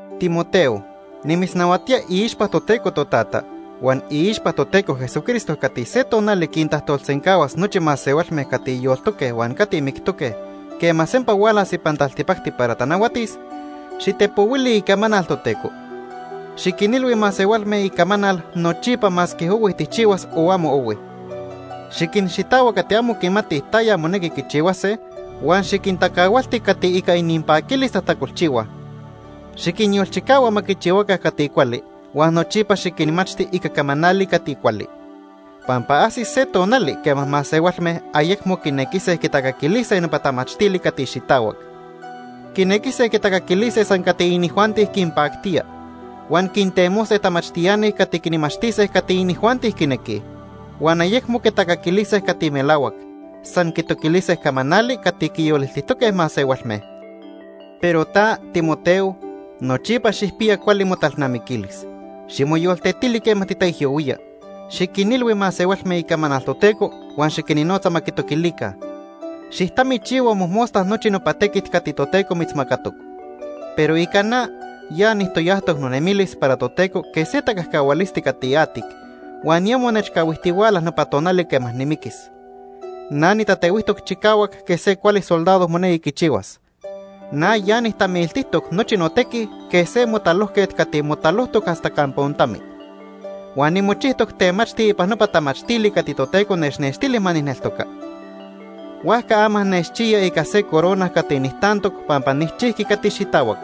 Timoteo, nimitznahuatía iixpa Toteco Totata huan iixpa Toteco Jesucristo cati se tonali quintajtolsencahuas nochi masehualme cati yoltoque huan cati mictoque quema sempa hualas ipan taltipacti para tanahuatis, xitepohuili icamanal Toteco. Xiquinilhui masehualme icamanal nochipa masque ohui tijchihuas o amo ohui. Xiquinxitahua cati amo quimatij taya monequi quichihuase huan xiquintacahualti cati ica ininpaquilis tajtacolchihuaj. Xiquinyolchicahua ma quichihuaca cati cuali huan nochipa xiquinmachti ica camanali cati cuali. Pampa ajsis se tonali quema masehualme ayecmo quinequise quitacaquilise nopa tamachtili cati xitahuac. Quinequise quitacaquilise san cati inijuanti quinpactía. Huan quintemose tamachtiani cati quinmachtise cati inijuanti quinequij. Huan ayecmo quitacaquilise cati melahuac, san quitoquilise camanali cati quiyoliltijtoque masehualme. Pero ta, Timoteo, nochipa xijpiya cuali motalnamiquilis. Ximoyoltetili quema titaijyohuía. Xiquinilhui masehualme icamanal Toteco huan xiquinnotza ma quitoquilica. Xijtamichihua mojmosta nochi nopa tequit cati Toteco mitzmacatoc. Pero ica na, ya nijtoyajtoc nonemilis para Toteco quej se tacajcahualisti cati atic, huan ya monechcahuijtihuala nopa tonali quema nimiquis. Na nitatehuijtoc chicahuac quej se cuali soldado monequi quichihuas. Na ya nijtamiltijtoc nochi notequi quej se motalojquet cati motalojtoc hasta campa ontami. Huan nimochijtoc temachti ipan nopa tamachtili cati Toteco nechnextili ma nijneltoca. Huajca ama nechchiya ica se corona cati nijtantoc pampa nijchijqui cati xitahuac.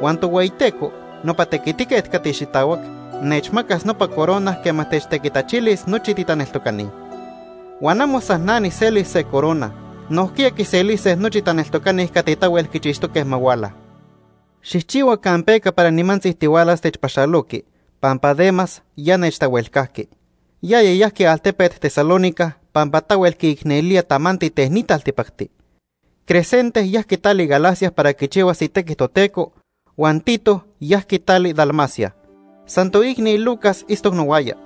Huan Tohueyiteco, nopa tequitiquet cati xitahuac, nechmacas nopa corona quema techtequitachilis nochi titaneltocani. Huan amo san na nijselis se corona, nojquiya quiselise nochi taneltocani cati tahuel quichixtoque ma huala. Xijchihua campeca para nimantzi tihualas techpaxaloqui, pampa Demas ya nechtahuelcajqui. Yaya yajqui altepet Tesalónica pampa tahuel quiicnelía tamanti ten ni taltipacti. Crescente yajqui tali Galacia para quichihuas itequi Toteco, huan Tito yajqui tali Dalmacia. San toicni Lucas itztoc nohuaya.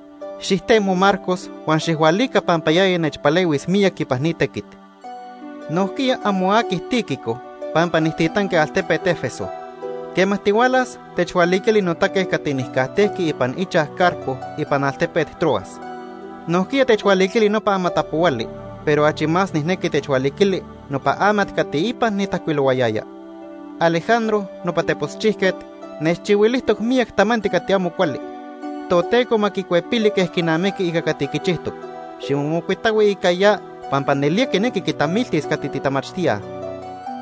Xijtemo Marcos huan xijhualica pampa yaya nechpalehuis miyac ipan ni tequit. Nojquiya amo aqui Tíquico pampa nijtitanqui altepet Éfeso. Quema tihualas, techhualiquili notaque cati nijcajtejqui ipan ichaj Carpo ipan altepet Troas. Nojquiya techhualiquili nopa amatapohuali, pero achi más nijnequi techhualiquili nopa amat cati ipan nitajcuilohuayaya. Alejandro nopa teposchijquet nechchihuilijtoc miyac tamanti cati amo cuali. Toteco ma quicuepili quej quinamiqui ica cati quichijtoc. Ximomocuitahui ica ya pampa nelía quinequi quitamiltis cati titamachtíaj.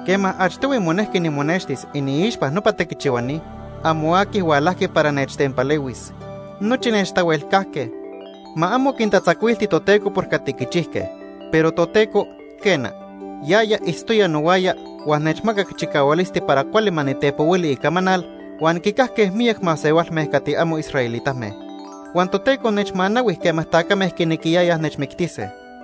Quema achtohui monejqui nimonextis iniixpa nopa tequichihuani, amo aqui hualajqui para nechtempalehuis. Nochi nechtahuelcajque. Ma amo quintatzacuilti Toteco por cati quichijque. Pero Toteco, quena, yaya itztoya nohuaya huan nechmacac chicahualisti para cuali ma nitepohuili icamanal huan quicajque miyac masehualme cati amo israelitame. Huan Toteco nechmanahui quema tacame quinequiyayaj nechmictise.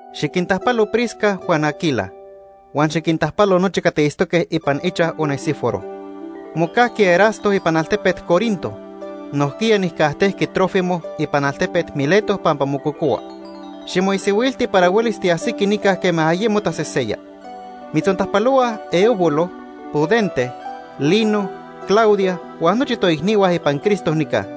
Xiquintajpalo Prisca huan Aquila. Huan xiquintajpalo nochi cati itztoque ipan ichaj Onesíforo. Mocajqui Erasto ipan altepet Corinto. Nojquiya nijcajtejqui Trófimo ipan altepet Mileto pampa mococohua. Ximoisihuilti para huelis tiajsiqui nica quema ayemo taseseya. Mitzontajpalohuaj Eubulo, Pudente, Lino, Claudia huan nochi toicnihua ipan Cristo nica.